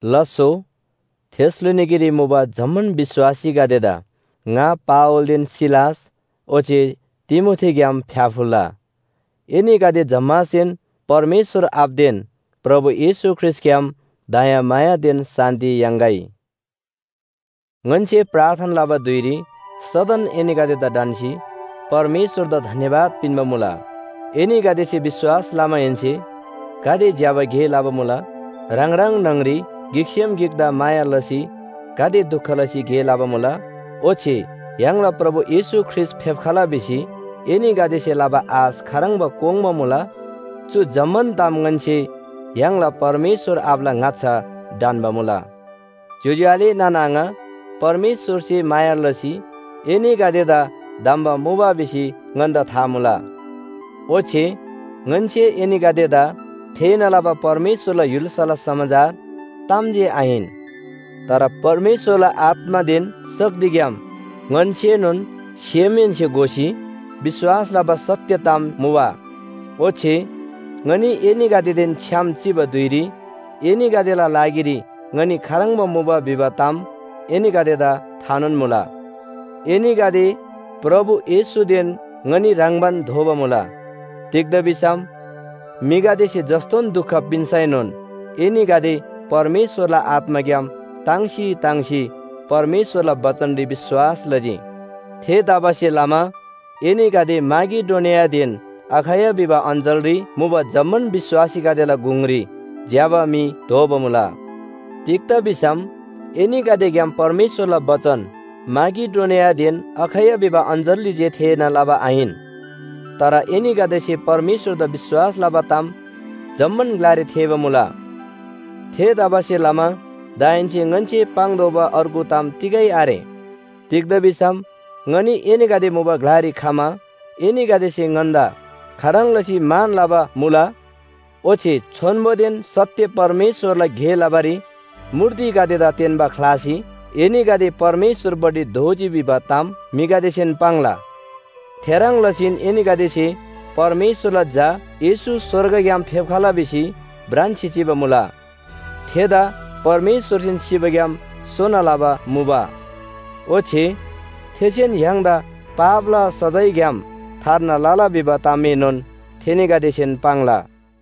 लास्‍सो थेसलोनिकेरी मुबा जम्‍मान विश्‍वासीगदेदा ङा पावलदेन सिलास ओच्‍छे तिमोथीग्‍याम फ्‍याफुल्‍ला! एनीगदे जम्‍मासेन परमेश्‍वर आबादेन प्रभु येशू ख्रीष्‍टग्‍याम दयामायादेन शान्‍ति याङ्‌गै। ङन्‍से प्रार्थना लबा धुइरी सदन एनीगदेदा ढन्‍सी परमेश्‍वरदा धन्‍यवाद पिन्‍बा मुला। एनीगदेसे विश्‍वास लमाहेन्‍से गाते ज्‍यबा गे लबा मुला। ह्राङ ह्राङ न्‍हङरी गिकसेम गिकदा माया लसी गाते दुख लसी गे लबा मुला। ओच्‍छे य्‍हाङला प्रभु येशू ख्रीष्‍ट फेप्‍खला भिसी एनीगदेसे लबा आश खाह्रङ्बा कोङ्बा मुला। चु जम्‍मान ताम ङन्‍से य्‍हाङला परमेश्‍वर आबाला ङाच्‍छा ढन्‍बा मुला। ज्‍योज्‍यो आले नाना आङा, परमेश्‍वरसे माया लसी एनीगदेदा धम्‍बा मुबा भिसी ङन्‍दा था मुला। ओच्‍छे ङन्‍से एनीगदेदा थेःना लबा परमेश्‍वरला य्‍हुल्‍साला समाचार ताम जे आहिन। तर परमेश्‍वरला आत्‍मादेन शक्तिग्‍याम ङन्‍सेनोन सेमहेन्‍से घोसी विश्‍वास लबा सत्‍य ताम मुबा। ओच्‍छे ङनी एनीगदेदेन छ्‌याम चिबा धुइरी एनीगदेला लागिरी ङनी खाह्रङ्बा मुबा भिबा ताम एनीगदेदा थानोन मुला। एनीगदे प्रभु येशूदेन ङनी ह्रङ्‌बान दोबा मुला। तिग्‍दा भिसम म्‍हिगदेसे जस्‍तोन दुख पिन्‍सैनोन एनीगदे परमेश्‍वरला आत्‍माग्‍याम ताङ्सी ताङ्सी परमेश्‍वरला बचनरी विश्‍वास लजी। थेतबासेलमा एनीगदे माकेडोनियादेन अखैया भिबा अञ्‍चलरी मुबा जम्‍मान विश्‍वासीगदेला गुङरी ज्‍यबा म्‍हि दोबा मुला। तिग्‍दा भिसम एनीगदेग्‍याम परमेश्‍वरला बचन माकेडोनियादेन अखैया भिबा अञ्‍चलरी जे थेःना लबा आहिन। तर एनीगदेसे परमेश्‍वरदा विश्‍वास लबा ताम जम्‍मान ग्‍लारी थेःबा मुला। थेतबासेलमा दाहेन्‍से ङन्‍से पाङ्तोःबा अर्गु ताम तिगै आरे। तिग्‍दा भिसम ङनी एनीगदे मुबा ग्‍लारी खमा एनीगदेसे ङन्‍दा खाह्रङ् लसी मान लबा मुला। ओच्‍छे छोन्‍बोदेन सत्‍य परमेश्‍वरला गे लबारी मूर्तिगदेदा तेन्‍बा ख्‍लासी एनीगदे परमेश्‍वरपट्टि दोःजी भिबा ताम म्‍हिगदेसेन पाङ्ला। थेह्रङ् लसीन एनीगदेसे परमेश्‍वरला झा येशू स्‍वर्गग्‍याम फेप्‍खला भिसी भ्रान्‍सी चिबा मुला। थेदा परमेश्‍वरसेन सिबाग्‍याम सोना लबा मुबा। ओच्‍छे थेसेन य्‍हाङदा पापला सजायग्‍याम थार्ना लला भिबा तामएनोन थेनीगदेसेन पाङ्ला।